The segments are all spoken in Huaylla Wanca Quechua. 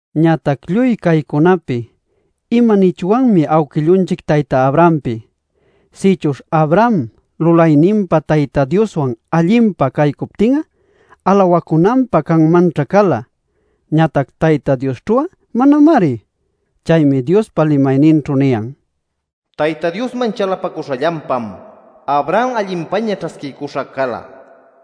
Ñatac lluy caycunapi ¿imanichwanmi awquillunchic tayta Abrahampi? Sïchuśh Abraham lulayninpa Tayta Dioswan allinpa caycuptin'a, alawacunanpä canmanćhá cala. Ñatac Tayta Diosćhu'a manamari. Chaymi Diospa limayninćhu niyan: “Tayta Diosman chalapacuśhallanpam Abraham allinpäña ćhasquiycuśha cala” nil.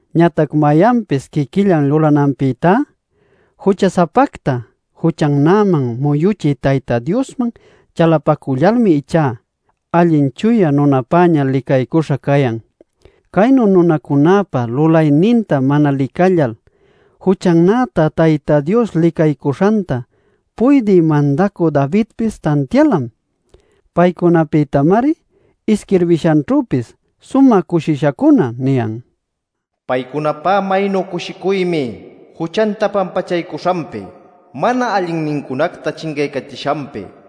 Ñatac mayanpis quiquillan lulananpïtá, jucha-sapacta juchannäman muyuchï Tayta Diosman chalapacullalmi ichá, allin chuya nunapäña licaycuśha cayan. Caynu nunacunäpa lulayninta mana licallal juchannäta Tayta Dios licaycuśhanta, puydï mandacü Davidpis tantialam. Paycunapïtamari isquirbishanćhüpis “sumä cushishacuna” niyan: “¡Paycunapá maynu cushicuymi juchanta pampachaycuśhanpi, mana allinnincunacta chincaycachishanpi!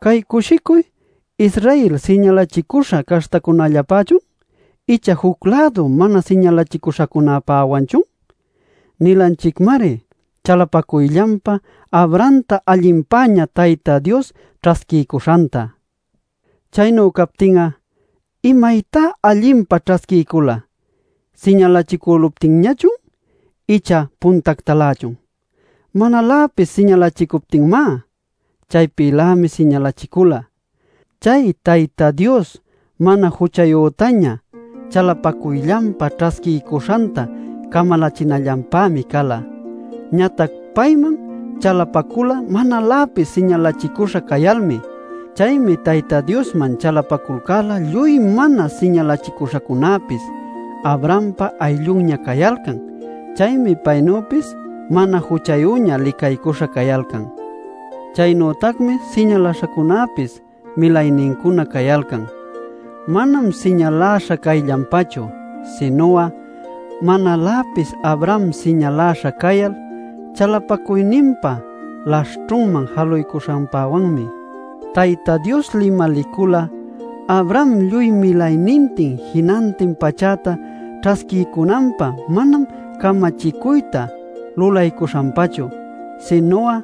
¿Cay cushicuy Israel siñalachicüśha caśhtacunallapächun icha juc-lädu mana siñalachicüśhacunäpäwanchun? Nilanchicmari chalapacuyllanpa Abrahamta allinpäña Tayta Dios ćhasquiycuśhanta. Chaynu captin'a ¿imaytá allinpa ćhasquiycula, siñalachicüluptinñachun icha puntactalächun? ¡Manaläpis siñalachicuptinmá! Chaypïlämi siñalachicula. Chay Tayta Dios mana juchayütaña chalapacuyllanpa ćhasquiycuśhanta camalachinallanpämi cala. Ñatac payman chalapacula manaläpis siñalachicüśha cayalmi. Chaymi Tayta Diosman chalapaculcal'a lluy mana siñalachicüśhacunäpis Abrahampa ayllunña cayalcan. Chaymi paynüpis mana juchayüña licaycuśha cayalcan. Chaynütacmi siñaläśhacunäpis milaynincuna cayalcan. Manam siñaläśha cayllanpachu, sinu'a manaläpis Abraham siñaläśha cayal chalapacuyninpa laśhćhunman jaluycuśhanpawanmi. Tayta Dios limalicula Abraham lluy milaynintin jinantin pachäta ćhasquiycunanpä manam camachicuyta lulaycuśhanpachu, sinu'a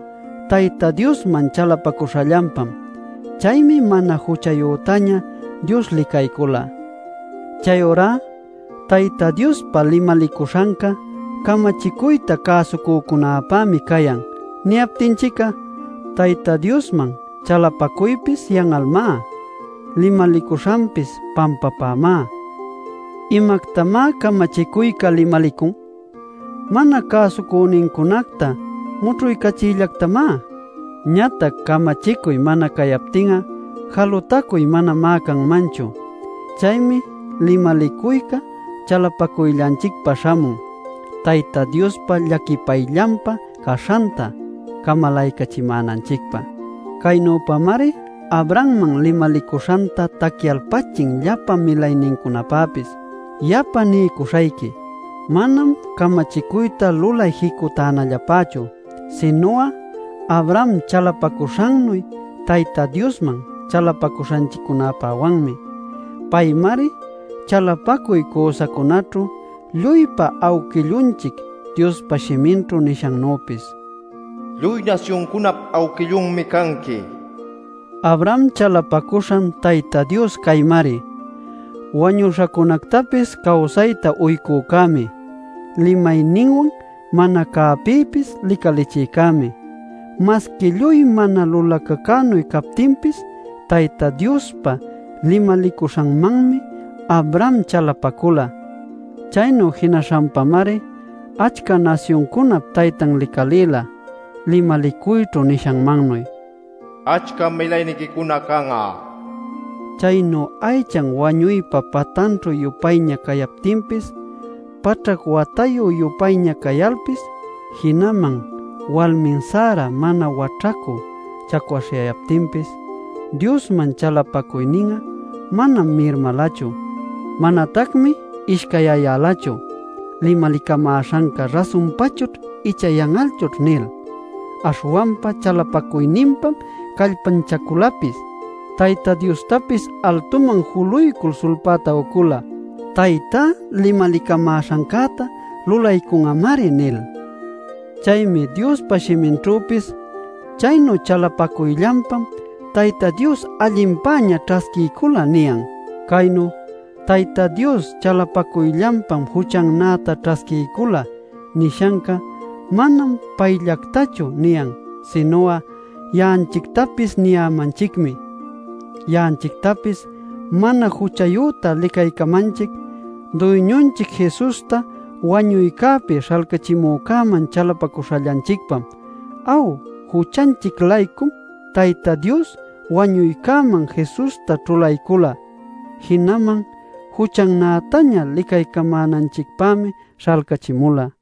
Tayta Diosman chalapacuśhallanpam. Chaymi mana juchayütaña Dios licaycula. Chayurá “Tayta Diospa limalicuśhanca camachicuyta cäsucücunapämi cayan” niyaptinchic'a, Tayta Diosman chalapacuypis yan'almá, limalicuśhanpis, pampapämá. ¿Imactamá camachicuyca limalicun? Mana cäsucünincunacta mućhuycachiyllactamá. Ñatac camachicuy mana cayaptin'a jalutacuy manamá canmanchu. Chaymi limalicuyca chalapacuyllanchicpa śhamun Tayta Diospa llaquipayllanpa caśhanta camalaycachimänanchicpä. Caynüpamari Abrahamman limalicuśhanta tacyalpachin llapa milaynincunapäpis. Yapa niycuśhayqui: Manam camachicuyta lulay jicutänallapächu, sinu'a Abraham chalapacuśhannuy Tayta Diosman chalapacuśhanchiccunäpäwanmi. Paymari chalapacuy cüsacunaćhu lluypa awquillunchic, Diospa shiminćhu nishannüpis: “Lluy nasyuncunap awquillunmi canqui” nil. Abraham chalapacuśhan Tayta Dios caymari: wañuśhacunactapis cawsayta uycücämi, limayninwan mana cäpïpis licalichïcämi. Masqui lluy mana lulacacünuy captinpis Tayta Diospa limalicuśhanmanmi Abraham chalapacula. Chaynu jinaśhanpamari achca nasyuncunap taytan licalïla, limalicuyćhu: “Achcam milayniquicuna can'a” nishanmannuy. Chaynu aychan wañuypa patanćhü-yupayña cayaptinpis, paćhac watayü-yupayña cayalpis, jinaman walmin Sara mana waćhacü chacwaśhyayaptinpis, Diosman chalapacuynin'a manam mirmalachu. Manatacmi ishcayyayälachu “Limalicamäśhanca rasunpachućh icha yan'alchućh” nil. Aśhwanpa chalapacuyninpam callpanchaculapis; Tayta Diostapis altuman juluycul sulpäta ucula “Taytá limalicamäśhancäta lulaycun'amari” nil. Chaymi Diospa shiminćhüpis, “Chaynu chalapacuyllanpam Tayta Dios allinpäña ćhasquiycula” niyan. Caynu “Tayta Dios chalapacuyllanpam juchannäta ćhasquiycula” nishanca manam payllactachu niyan sinu'a ya'anchictapis niyämanchicmi. Ya'anchictapis mana juchayüta licaycamanchic, Duyñunchic Jesusta wañuycäpi śhalcachimücäman chalapacuśhallanchicpam. Aw, juchanchic-laycum Tayta Dios wañuycäman Jesusta ćhulaycula. Jinaman juchannätaña licaycamänanchicpämi śhalcachimula.